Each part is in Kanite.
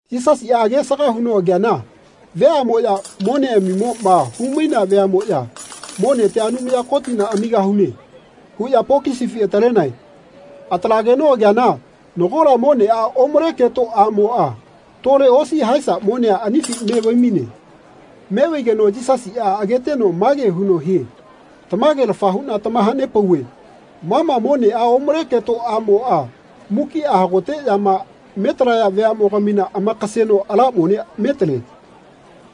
Yisasiꞌa agesaga huno ageana veaꞌmoya moneꞌamimoꞌma haimainea veaꞌmoꞌya “Monetia Anumaya Kotina amigahune.” huꞌya pokisifi atalenae. Atalageno ageana nagola moneꞌa omale keto aꞌmoꞌa tole osi haesa monea anifi me vaimaine. Me vaigeno Yisasiꞌa ageteno mage huno hie “Tamagelafa huꞌna tamahanepauve ma ma moneꞌa omale keto aꞌmoꞌa mukiꞌa hagoteꞌyama metalaya veaꞌmogamina amakaseno ala mone metale.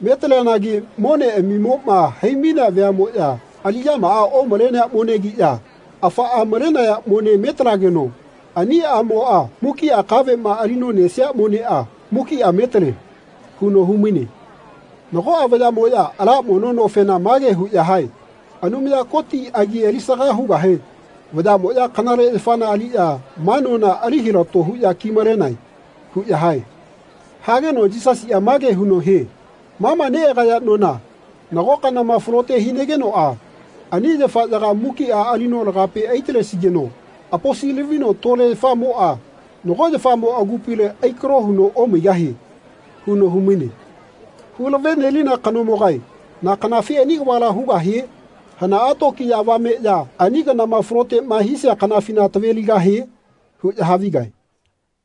Metaleanagi moneꞌami-moꞌma haimainea veaꞌmoꞌya aliꞌyamaꞌa omalenea monegiꞌya, afaꞌa malenaya mone metalageno ani aꞌmoꞌa mukiꞌa kaveꞌma alino nesia moneꞌa mukiꞌa metale.” huno humaine. Nagoꞌa vayaꞌmoꞌya ala mono nofena mage huꞌya hae “Anumaya Koti agi alisaga hugahe vayaꞌmoꞌya kanale yafana aliꞌya ma nona ali hilato huꞌya kimalenae.” huꞌya hae. Hageno Yisasiꞌa mage huno hie “Ma ma neꞌagaya nona nago kanama falote hinagenoꞌa ani yafaꞌyaga mukiꞌa alino lagape aitalesigeno aposi-lavino tole yafamoꞌa nago yafamo agupile aikalo huno omaigahie.” huno humaine. “Hulave nelina kanomogae na kanafi ani kavala hugahie? Hanaꞌa tokiya avameꞌya ani kanama faloteꞌma hisia kanafina taveligahie?” huꞌya havigae.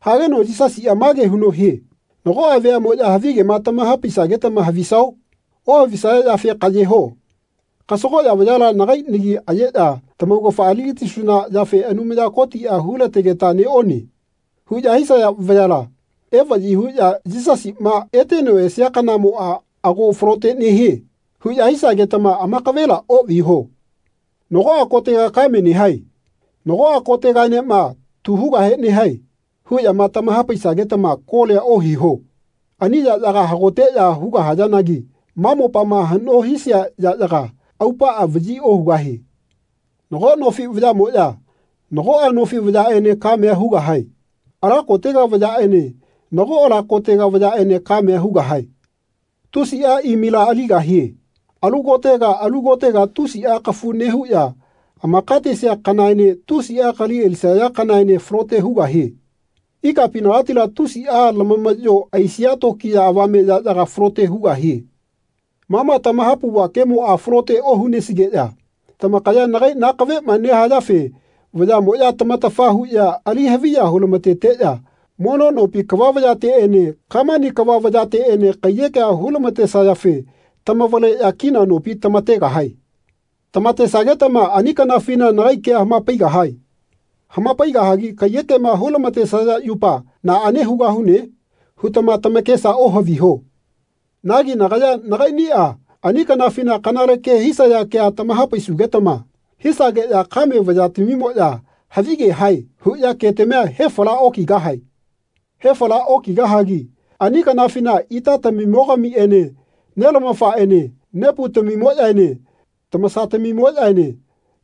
Hageno Yisasiꞌa mage huno hie “Nagoꞌa veaꞌmoꞌya havigema tamahapaisagetama havisao? Ohavisaya yafe kaꞌye ho. Kasagoꞌya vayala nagai nagi ayeꞌya ‘Tamaugafa aligatisuna yafe Anumaya Kotiꞌa hulategeta neꞌone.’ huꞌya hisaya vayala evaꞌyi huꞌya ‘Yisasiꞌma eteno esia kanamoꞌa ago falote nehie.’ huꞌya hisagetama amakavela oꞌviho. ‘Nagoꞌa kotega kame nehae. Nagoꞌa kotegaenema tu hugahe nehae.’ huꞌyama tamahapaisagetama kolia ohiho. Ani yaꞌyaga hagoteꞌya hugahayanagi ma mopama haꞌno hisia yaꞌyaga aupaꞌa vaꞌyi ohugahie. Nago nofi vayaꞌmoꞌya nagoꞌa nofi vayaꞌene kamea hugahae. Ala kotega vayaꞌene nago ala kotega vayaꞌene kamea hugahae. Tusiꞌa imila aligahie. Alu kotega alu kotega tusiꞌa kafu nehuꞌya amakatesia kanaene tusiꞌa kali alisaya kanaene falote hugahie. Ikapinagatila tusiꞌa lamamaꞌyo aisia tokiya avame yaꞌyaga falote hugahie. Ma ma tamahapauva kemoꞌa falote ohunesigeꞌya tamakaya nagai nakaveꞌma nehayafe vayaꞌmoꞌya tamatafa huꞌya ali haviya hulamateteꞌya mono nopi kava vayateꞌene Kamani kava vayateꞌene kaiyekea hulamatesayafe tamavaleꞌya kina nopi tamategahae. Tamatesagetama ani kanafina nagai kea hamapaigahae. Hamapaigahagi kaiyekema hulamatesaya yupa ‘Naꞌane hugahune?’ hutama tamakesa ohaviho. Nagi nagaya nagaiꞌniꞌa ani kanafina kanale ke hisaya kea tamahapaisugetama hisageꞌya kame vayatamimoꞌya ‘Havige hae.’ huꞌya ketamia hefala okigahae. Hefala okigahagi ani kanafina itatamimogamiꞌene nelamafaꞌene neputamimoꞌyaene tamasatamimoꞌyaene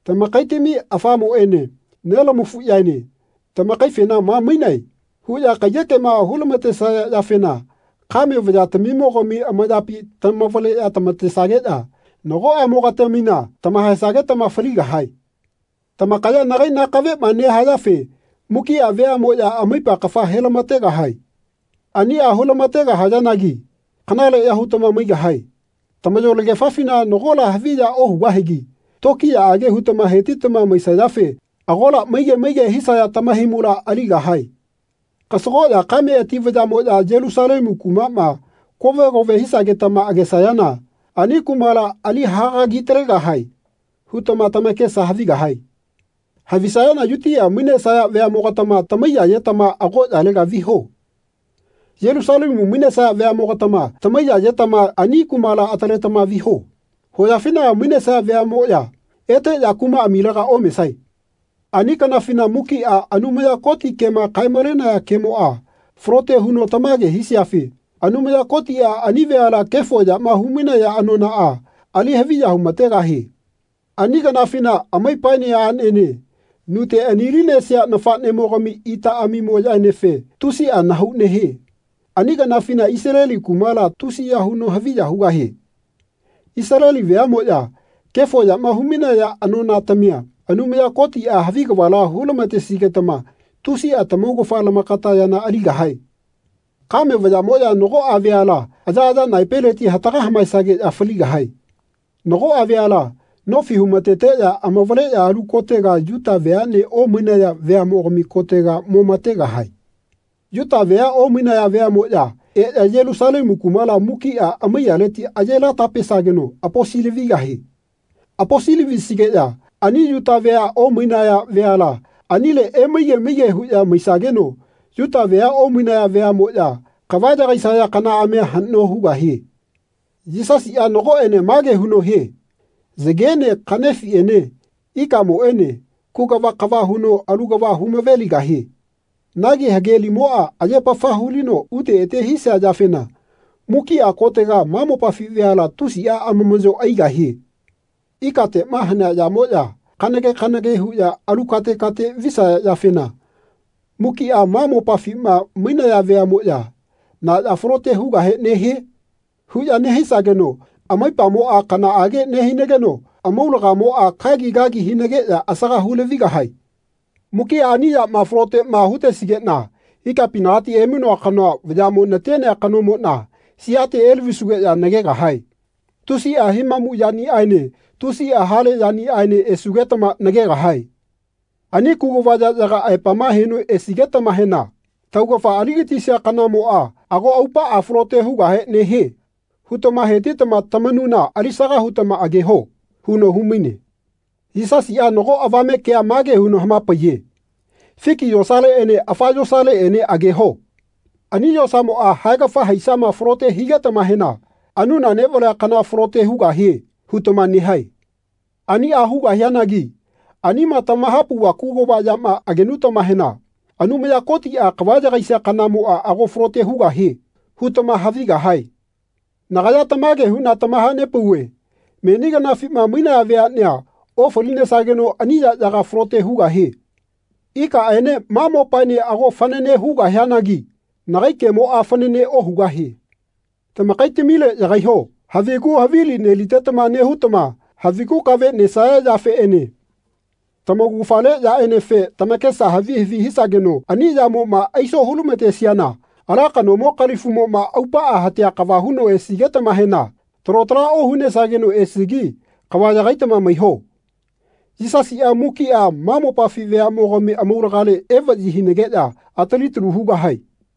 tamakaitami afamoꞌene nelamafuꞌyaene tamakaifena ‘Ma mainae.’ huꞌya kaiyekema hulamatesaya yafena kame vayatamimogami amayapi tamavaleꞌya tamatesageꞌya nagoꞌamogatamina tamahaesagetama faligahae. Tamakaya nagai nakaveꞌma nehayafe mukiꞌa veaꞌmoꞌya amaipa kafa helamategahae. Aniꞌa hulama-tegahayanagi kanaleꞌya hutama maigahae. Tamayolegefafina nagola haviya ohugahigi tokiyaꞌage hutama hetitama maisayafe agola maige maige hisaya tamahaimula aligahae.” “Kasagoꞌya kame ati vayaꞌmoꞌya Yelusalemu kumaꞌma kove kove hisagetama agesayana ani kumala ‘Ali hagagi-talegahae.’ hutama tamakesa havigahae. Havisayana Yutia mainesaya veaꞌmogatama tamaiya-yetama agoꞌyalega viho. Yelusalemu mainesaya veaꞌmogatama tamaiya-yetama ani kumala ataletama viho. Hoyafinaga mainesaya veaꞌmoꞌya eteꞌya kumaꞌamilega omesae. Ani kanafina mukiꞌa Anumaya Koti kema kae-malenaya kemoꞌa falote huno tamage hisiafe Anumaya Kotiꞌa ani veala kefo yama humainaya anonaꞌa ali haviya humategahie. Ani kanafina amaipaene aꞌnene nute ani-linesia nafaꞌnemogami itaꞌamimoꞌyaenefe tusiꞌa nahau nehie. Ani kanafina Isaleli kumala tusiya huno haviya hugahie. Isaleli veaꞌmoꞌya kefo yama humainaya anonatamia Anumaya Kotiꞌa havi kavala hulamatesigetama tusiꞌa tamaugafa lamakata yana aligahae. Kame vayaꞌmoꞌya nagoꞌa veala ayaꞌaya naepeleti hataga hamaesageꞌya faligahae. Nagoꞌa veala nofi humateteꞌya amavaleꞌya alu kotega Yuta veaꞌne omainaya veaꞌmogami kotega momategahae. Yuta vea omainaya veaꞌmoꞌya eꞌya Yelusalemu kumala mukiꞌa amaiyaleti ayelata-pesageno aposi-lavigahie. Aposi-lavisigeꞌya ani Yuta vea omainaya veala anile emaige maige huꞌya maisageno Yuta vea omainaya veaꞌmoꞌya kava yagaisaya kanaꞌamia haꞌno hugahie.” Yisasiꞌa nagoꞌene mage huno hie “Yagene kaꞌnefiꞌene ikamoꞌene kugava kava huno alu kava humaveligahie. Nagi hage limoꞌa ayepafa hulino ute ete hisia yafena mukiꞌa kotega ma mopafi veala tusiꞌa amamaꞌyo aigahie. Ikateꞌma hanea yamoꞌya kanage kanage huꞌya alu kate kate visaya yafena mukiꞌa ma mopafima mainaya veaꞌmoya ‘Na ya falote hugahe nehie?’ huꞌya nehisageno amaipamoꞌa kanaꞌage nehinageno amaulagamoꞌa kagi kagi hinageꞌya asaga hulavigahae. Mukiꞌa ani yamaꞌa faloteꞌma hutesigeꞌna ikapinagati emainoa kanoa vayaꞌmo natenea kanomoꞌna siate elavisugeꞌya nagegahae. Tusiꞌa himamu yaniꞌaene tusiꞌa hale yaniꞌaene esugetama nagegahae. Ani kugava yaꞌyaga aepama heno esigetamahena ‘Taugafa aligatisia kanamoꞌa ago aupaꞌa falote hugahe nehie.’ hutama hetitama tamanuna alisaka hutama ageho.” huno humaine. Yisasiꞌa nago avame kea mage huno hamapaiye “Fiki yosaleꞌene afa yosaleꞌene ageho. Ani yosamoꞌa haegafa haisama falote higetamahena ‘Anuna neꞌvalea kana falote hugahie.’ hutama nehae. Aniꞌa hugahianagi anima tamahapauva kugava yama agenutamahena ‘Anumaya Kotiꞌa kava yagaisia kanamoꞌa ago falote hugahie.’ hutama havigahae. Nagaya tamage huꞌna tamahanepauve meni kanafima mainaya veaꞌnea ofalinesageno ani yaꞌyaga falote hugahie. Ikaꞌene ma mopaene ago fanane hugahianagi nagai kemoꞌa fanane ohugahie. Tamakaitamile yagaiho. Havigu havili nelitetama nehutama havigu kave nesaya yafeꞌene tamaugafale yaꞌenefe tamakesa havi havi hisageno ani yamoꞌma aiso hulamatesiana ala kanomo kalifumoꞌma aupaꞌa hatea kava huno esigetamahena talo tala ohunesageno esigi kava yagaitama maiho. Yisasiꞌa mukiꞌa ma mopafi veaꞌmogami amaulagale evaꞌyi hinageꞌya atali-talu hugahae.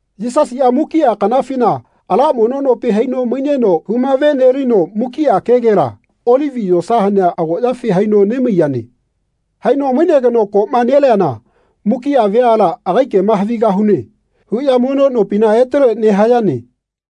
Yisasiꞌa mukiꞌa kanafina ala mono nopi haino maineno humavenelino mukiꞌa kegela Olivi yosa hanea agoꞌyafi haino nemaiyane. Haino mainegeno koꞌma neleana mukiꞌa veala “Agai kema havigahune.” huꞌya mono nopina etele nehayane.